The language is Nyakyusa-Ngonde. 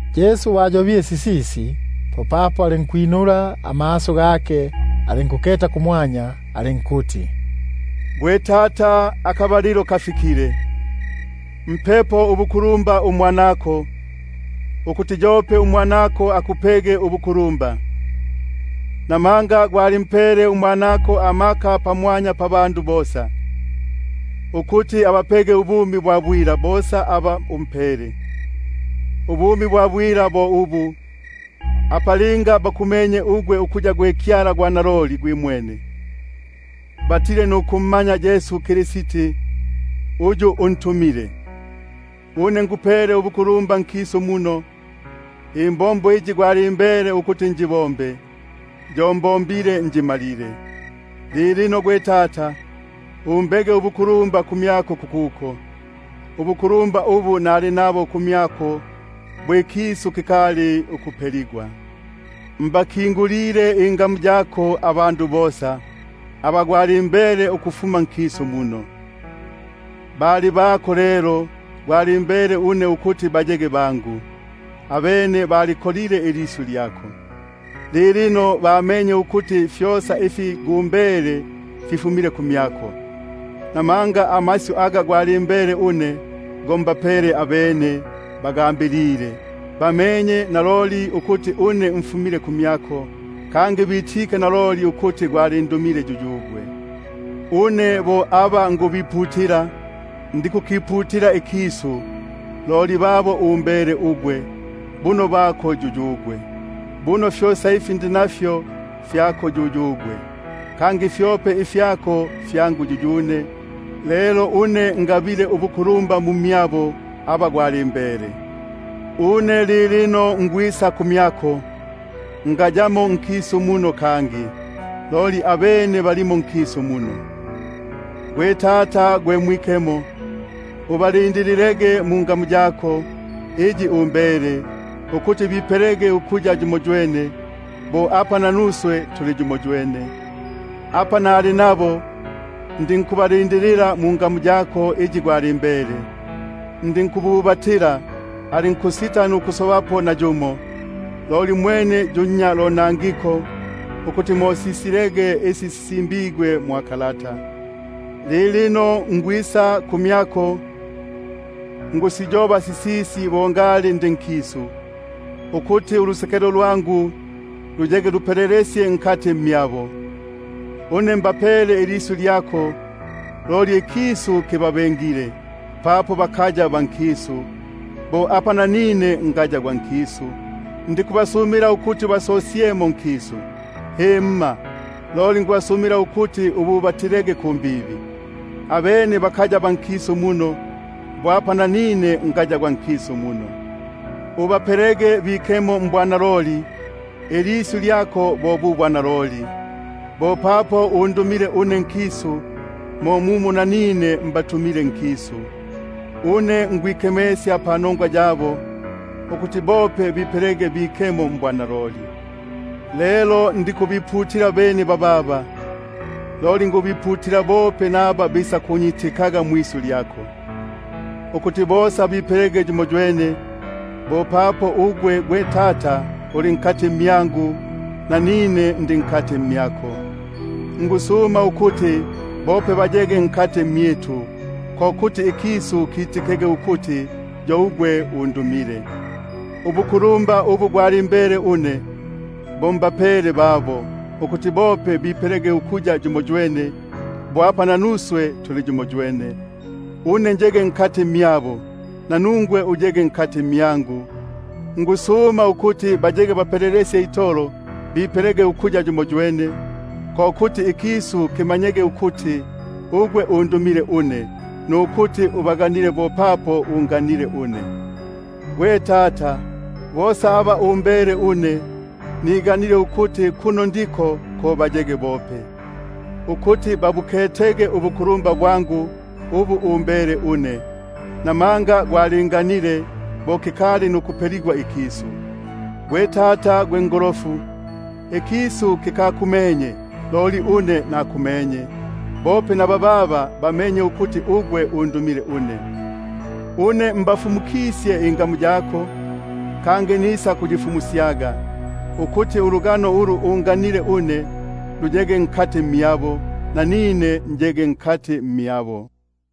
Bo ayobile sisisi Yesu, popapo alinkwinula amaso gake, alinkuketa kumwanya alinkuti: Gwe Tata, kisile akabalilo; mpepo ubukulumba uMwanako, ukuti yope uMwanako akupege ubukulumba. Bo apa umpele amaka pamwanya pabandu bosa, ukuti abapege ubumi bwa bwila bosa aba umpele. Ubu bo bumi bwa bwila, linga bakumenye ugwe ukuya gwe Kyala gwa naloli gwimwene, batile nukummanya Yesu Kristi uyu untumile. Une ngupele ubukulumba ugwe nkisu muno, imbombo iyi gwalimbele ukuti njibombe, yo njimalile. Lilino lelo gwe Tata, umbege ubukulumba kumyako kukuko, ubukulumba ubu nali nabo kumyako bo kikali ukuyako ikisu. Mbakingulile ingamu yako abandu, aba umhele ukufuma nkisu muno; bali bako lelo umhele une, abene ilisyu lyako balibikile. Lilino bamenye ukuti fyosa ifi umhele, fyo fifu- mile kumyako. Buno amasyu aga umhele une, go mbapele, abene bagambilile, bamenye naloli ukuti mfumile kumyako; kangi bitike ukuti gwalindumile yuyugwe. Une nikubasumila babo, ndikukisumila ikisu, loli babo umhele ugwe, buno bako yuyugwe. — Buno fyosa ifyangu fyako yuyugwe, kangi ifyako fyo fyangu; — lelo une ngabile ubukulumba mu mmyabo. Une ngayamo nkisu muno kangi, loli abene balimo nkisu muno, lelo une nikwisa kumyako. Gwe Tata gwe Mwikemo, ubalindililege mungamu yako iyi umhele, ukuti bipelege ukuya yumoywene, bo apa nanuswe tuli yumoywene. Apa nali nabo, ndinkubalindilila mungamu yako iyi gwalimbele, ndinkububatila, alinkusita nukusobapo nayumo mmyabo, loli mwene yu nnya lonangiko, ukuti mo sisilege isi sisimbigwe. Loli lilino nikwisa kumyako, nikusiyoba sisisi bo ngali ndi nkisu, ukuti ulusekelo lwangu luyege lupelelesye itolo mmyabo. Une mbapele ilisyu lyako, loli ikisu kibabengile, papo bakaya ba nkisu, bo apa nanine ngaya gwa nkisu. Ndikusuma ukuti ubasosyemo nkisu, himma, loli ukuti ubaba- tilege kumbibi. Bakaya ba nkisu muno, bo apa nanine ngaya gwa nkisu muno. Bapelege bikemo mbwanaloli; ilisyu lyako bo bu bwanaloli. Bo papo undumile une nkisu, mo mumo nanine mbatumile nkisu. Une nkwikemesya panongwa yabo, ukuti bope bipelege bikemo mbwanaloli. Lelo ndikubasumila bene bababa, loli nikubasumila bope aba bikunyitikilaga mwisyu lyabo, ko kuti bosa bipelege yumoywene, bo papo ugwe Tata uli mmyangu, nanine ndi mmyako; ukuti bope bayege mu mmyitu, ko kuti ikisu kiti- kege ukuti yo ugwe undumile. Ubukulumba ubu gwalimbele une bo mbapele babo, ukuti bope bipelege ukuya yumoywene, bo apa nanuswe tuli yumoywene; une ndi mmyabo, nanungwe uli mmyangu, po ukuti bipelege bapelelesye itolo ukuya yumoywene, ko kuti ikisu kimanyege ukuti ugwe undumile une, nukuti ubaganile bo apa unganile une. Gwe Tata, bosa aba umhele une, niganile ukuti kuno ndiko une ko bayege bope, ukuti babuketege ubukulumba bwangu ubu umhele une, namanga gwalinganile bo kikali nukwaligwa ikisu. Gwe Tata gwe ngolofu, ikisu kikakumenye, loli une nakume- nye, bope bababa bamenye ukuti ugwe undumile une. Une nabafumukisye ingamu yako, kangi nisakuyifumusyaga, ukuti ulugano ulu unganile une luyege mmyabo, nanine njege mu mmyabo.